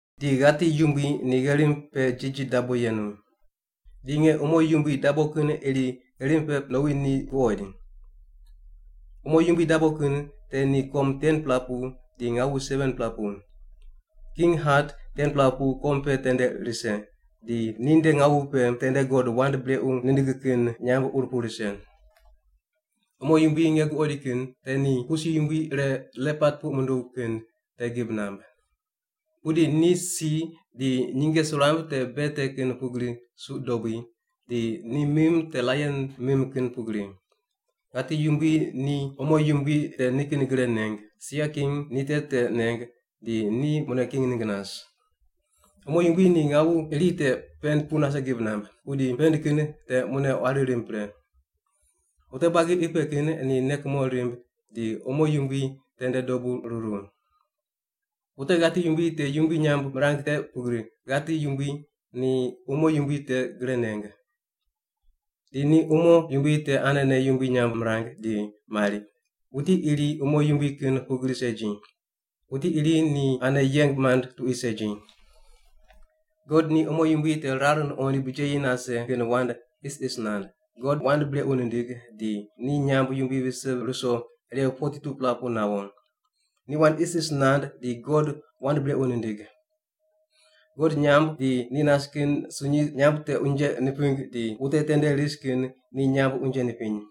Di ghati yumbui ni gherim pe jiji dabo yenu. Di nge umo yumbui dabo kin iri gherim pe nowi ni guqoid. Umo yumbui dabo kin te ni kom 10-pela pu di ngawu 7-pela pu. King hat 10-pela pu kom pe tende rise, di ninde ngawu pe tende God wand brequ nindig kin nyamb ur pu rise. Umo yumbui nge guqoid kin te ni pusi yumbui ire lepat puq munduw kin te gib namb. Pudi ni si di nyinge suramb te bea te kin pugri suq dobui, di ni mim te laion mim kin pugri. Ghati yumbui ni umo yumbui te nikin gre neng, sia king ni te te neng, di ni mune king ningg nas. Umo yumbui ni ngawu iri te pend pu nase gib namb, pudi pend kin te mune quari rimb pre. Wute buagi qi pe kin ni nei kumo rimb di umo yumbui tende dobu ruru. Wute ghati yumbui te yumbui nyamb mirang te pugri ghati yumbui ni umo yumbui te gre neng. Di ni umo yumbui te anene yumbui nyamb mirang di mari, “Wuti iri umo yumbui kin pugri segi. Wuti iri ni ane yeng mand tuqui segi.” God ni umo yumbui te rar nuqoind bijeyi nase kin wand isis nand, God wand brequ nindig di ni nyamb yumbui vise ruso irew 42-pela pu nawo. Ni wand isis nand di God wand brequ nindig. God nyamb di ni nas kin sunyi nyamb te unje niping di wute tende ris kin ni nyamb unje nipiny.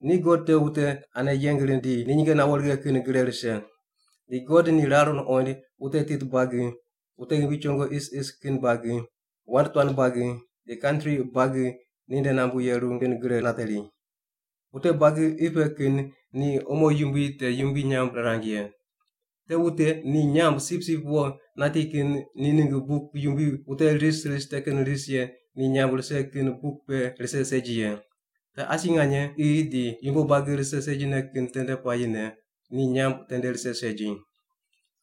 Ni God te wute ane yeng rind di ni nyinge nawo righe kin gre rise. Di God ni rar nuqoind wute tit buagi, wute ghimbi chongo isis kin buagi, wand tuan buagi, di kantri buagi ninde nambu yeru kin gre nateri. Wute buagi qi pe kin ni umo yumbui te yumbui nyamb rirang ye. Te wute ni nyamb Sipsip Wo nati kin ni ningg buk yumbui wute ris ris te kin ris ye ni nyamb rise kin buk pe rise segi ye. Te asi nganye qi di yumbo buagi rise segine kin tende puayine ni nyamb tende rise segi.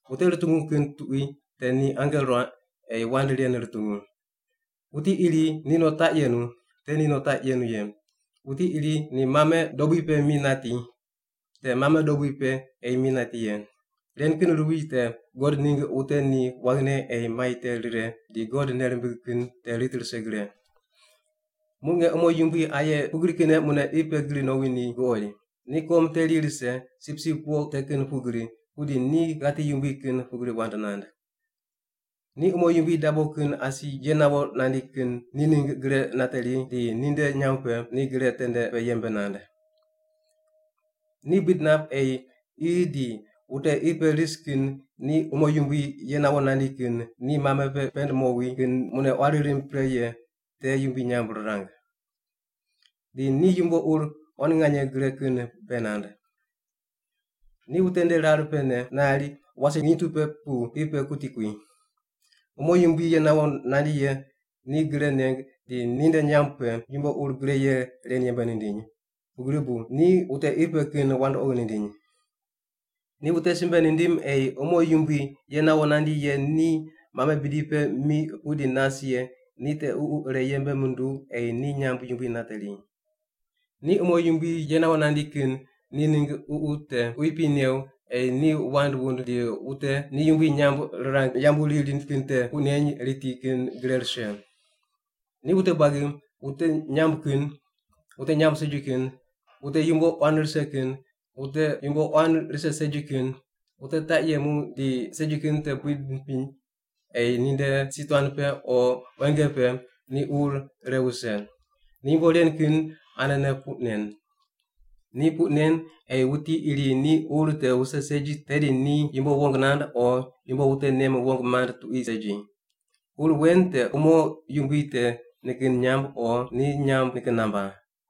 Wute rutungu kin tuqui te ni ange ruaq ei wand ren rutungu. Wuti iri ni no taq yenu, te ni no taq yenu ye. Wuti iri ni mame dobui pe mi nati, te mame dobui pe ei mi nati ye. Ren kin ruwi te God ningg wute ni waghine ei mai te rire di God nei rimbig kin te rit rise gre. Muq nge umo yumbui aye pugri kinne mune qi pe gri nowi ni guqoid. Ni kom teri rise, sipsip wo te kin pugri, pudi ni ghati yumbui kin pugri wand nand. Ni umo yumbui dabo kin asi ye nawo nandi kin ni ningg gre nateri di ninde nyamb pe ni gre tende pe yembe nand. Ni buid nap ei qi di wute qi pe ris kin ni umo yumbui ye nawo nandi kin ni mame pe pend mowi kin mune quari rimb pre ye te yumbui nyamb rirang. Di ni yumbo ur quan nganye gre kin bei nand. Ni wute nde rar pene nari wase nginy tu pe pu qi pe kuti kui. Umo yumbui ye nawo nandi ye ni gre neng di ni nde nyamb pe yumbo ur gre ye ren yembe nindiny, pugri bu ni wute qi pe kin wandoqi nindiny. Ni wute simbe nindim ei umo yumbui ye nawo nandi ye ni mame bidi pe mi pudi nas ye ni te ququ ire yembe nunduw ei ni nyamb yumbui nateri. Ni umo yumbui ye nawo nandi kin ni ningg ququ te quipi new ei ni wand wund di wute ni yumbui nyamb rirang yambu riri kin te puq neny riti kin gre rise. Ni wute buagi, wute nyamb kin, wute nyamb segi kin, wute yumbo quan rise kin, wute yumbo quan rise segi kin, wute taq yemu di segi kin te buid nipiny ei ninde si tuan pe o quenge pe ni ur ire wuse. Ni yumbo ren kin anene puq nen. Ni puq nen ei wuti iri ni ur te wuse segi tedi ni yumbo wong nand o yumbo wute nem wong mand tuqui segi. Ur wen te umo yumbui te nikin nyamb o ni nyamb nikin namba.